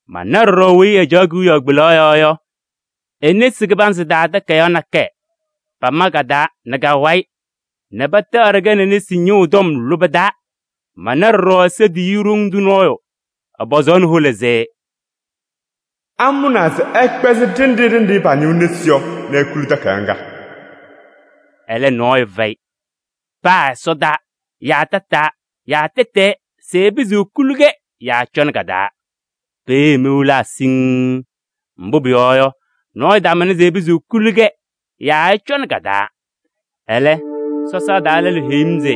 Mana ɖɔɖɔ weyi ɛcaɣ kewiyaɣ kpelaɣ yɔɔ yɔ e-nesi kɩbanzɩ taa takayaɣ nakɛyɛ, pama ka-taa nɛ ka-wayɩ nɛ pataaɖɩ-kɛ nɛ nesi ñɩɣʋ tɔm lʋbɛ taa. Mana ɖɔɖɔ Ɛsɔ tiyiyu ɖoŋ tʋ nɔɔyʋ, ɛpɔzaɣnɩ hola se: “Amʋnaa se ɛkpɛzɩ ɖenɖe ɖenɖe pañɩɣ nesi yɔ nɛ ekuli takayaɣ ŋga?” Ɛlɛ, nɔɔyʋ fɛyɩ: paa ɛsɔdaa yaa tataa yaa tɛtɛɛ se ɛpɩzɩɣ ekuli-kɛ yaa ɛcɔnɩ ka-taa. Peeye mewilaa siŋŋ. Mbʋ pʋyɔɔ yɔ, nɔɔyʋ tamʋnɩ se ɛpɩzɩɣ ekuli-kɛ yaa ɛcɔnɩ ka-taa. Ɛlɛ, sɔsaa taa lɛlʋ heyi-m se: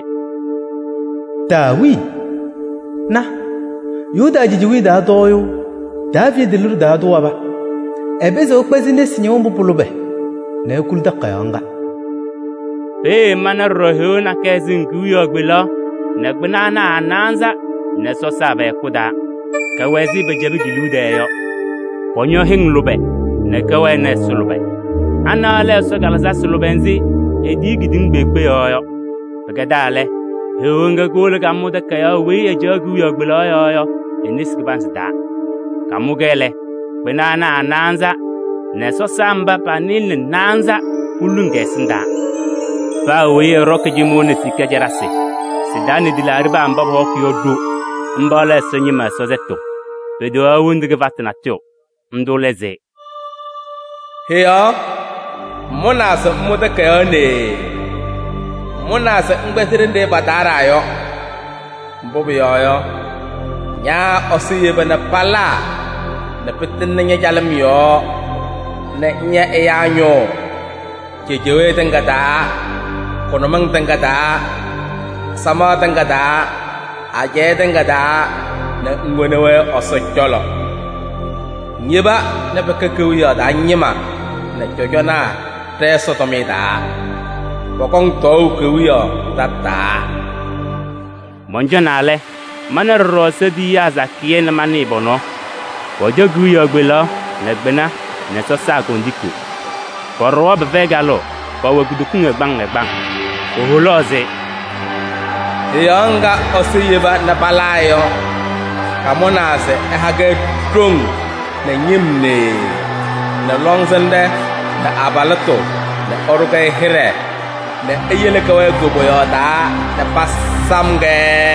“Taawii! Na, Yuda cejewiye taa tɔɔyʋʋ Daaviidi liɖe taa tʋ waba: ɛpɩzɩɣ ɛkpɛzɩ nesi ñɩɣʋ mbʋ pʋ-lʋbɛ nɛ ekuli takayaɣ ŋga.” Peeye mana ɖɔɖɔ Heɣa nakɛyɛ sɩŋ kewiyaɣ kpelaɣ nɛ kpɩna ana a-naanza nɛ sɔsaa pɛ-hɛkʋ taa. Kɛwɛ ɛzɩ pɛcɛbɩ ke-liu tɛɛ yɔ. Kɔñɔ hɩŋ lʋbɛ nɛ kɛwɛnɩ ɛza lʋbɛ. Ana lɛ Ɛsɔ kalɩzasɩ lʋbɛ nzɩ etiyi kedeŋa kpeekpe yɔɔ yɔ. Pɩkɛdaa lɛ, Heɣa ŋga kowolo kamʋ takayaɣ weyi ɛcaɣ kewiyaɣ kpelaɣ yɔɔ yɔ e-nesi kɩbanzɩ taa. Kamʋ-kɛ lɛ, kpɩna ana a-naanza nɛ sɔsaa mba pa-nɩɩlɛ nɛ naanza poluŋ kɛ-ɛsɩndaa. Paa weyi ɛɖɔkɩ cɩmʋʋ nɛ sika caɖasɩ, sɩ-taa nɛ tɩlaaɖɩnaa mba pɔhɔkɩ yɔ ɖo. Mba lɛ Ɛsɔ ñɩma Ɛsɔ sɛtʋ. Peteɣaɣ hendu kɩfatʋ natʋyʋ. Ndʋ lɛ se: “Heɣa ŋmʋnaa se ŋmʋ takayaɣ nee. Ŋmʋnaa se ŋkpɛzɩ ɖenɖe pataaɖaa yɔ. Mbʋ pʋyɔɔ yɔ, ña Ɛsɔ yeba nɛ palaa nɛ pɩtɩŋnɩ ña-calɩm yɔɔ nɛ ŋya ɛyaa ñʋʋ cejewee tɩŋa taa, kʋnʋmɩŋ tɩŋa taa, samaɣ tɩŋa taa, ajɛɛ tɩŋa taa nɛ ŋwoni-wɛ Ɛsɔ cɔlɔ. Ŋyeba nɛ pɛkɛ kewiyaɣ taa ñɩma nɛ cɔjɔnaa ɖɛ-Ɛsɔ tʋmɩyɛ taa. Pɔkɔŋ tɔɔʋ kewiyaɣ tataa.” Mɔncɔnaa lɛ, mana ɖɔɖɔ Ɛsɔ tiyiyaa sakɩyɛ nɛ manɩɩ pɔ-nɔɔ. Pɔcɔ kewiyaɣ kpelaɣ nɛ kpɩna nɛ sɔsaa kondiko. Pɔɖɔwa pɩfɛyɩ kalʋʋ, pɛwɛ kutokiŋ ɛgbaŋ ɛgbaŋ. Poholaɣ se: “Heɣa ŋga Ɛsɔ yeba nɛ palaa yɔ, kamʋnaa se ɛha-kɛ ɖoŋ nɛ ñɩm nee nɛ lɔŋsɩnɖɛ nɛ abalɩtʋ nɛ ɛɖʋ-kɛ hɩɖɛ nɛ eyele kɛwɛɛ koboyaɣ taa nɛ pasam-kɛ.”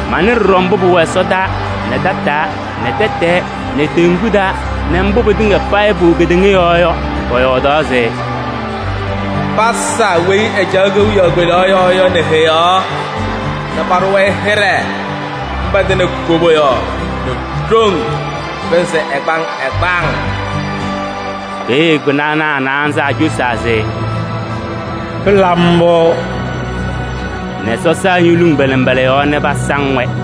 Manɩ ɖɔɖɔ mbʋ pʋwɛ ɛsɔdaa nɛ tataa nɛ tɛtɛɛ nɛ teŋgu taa nɛ mbʋ pɩtɩŋa payɩ pʋwɛ kedeŋa yɔɔ yɔ, pɔyɔɔdaɣ se: “Pasa weyi ɛcaɣ kewiyaɣ kpelaɣ yɔɔ yɔ nɛ Heɣa nɛ paɖʋ-wɛ hɩɖɛ, mba tɩnɩ koboyaɣ nɛ ɖoŋ pɩnzɩ ɛgbaŋ ɛgbaŋ!” Peeye kpɩna ana a-naanza acosaa se: “Pɩla mbʋ!” Nɛ sɔsaa ñoluŋ pa-nɩmbɔla yɔɔ nɛ pasaŋ-wɛ.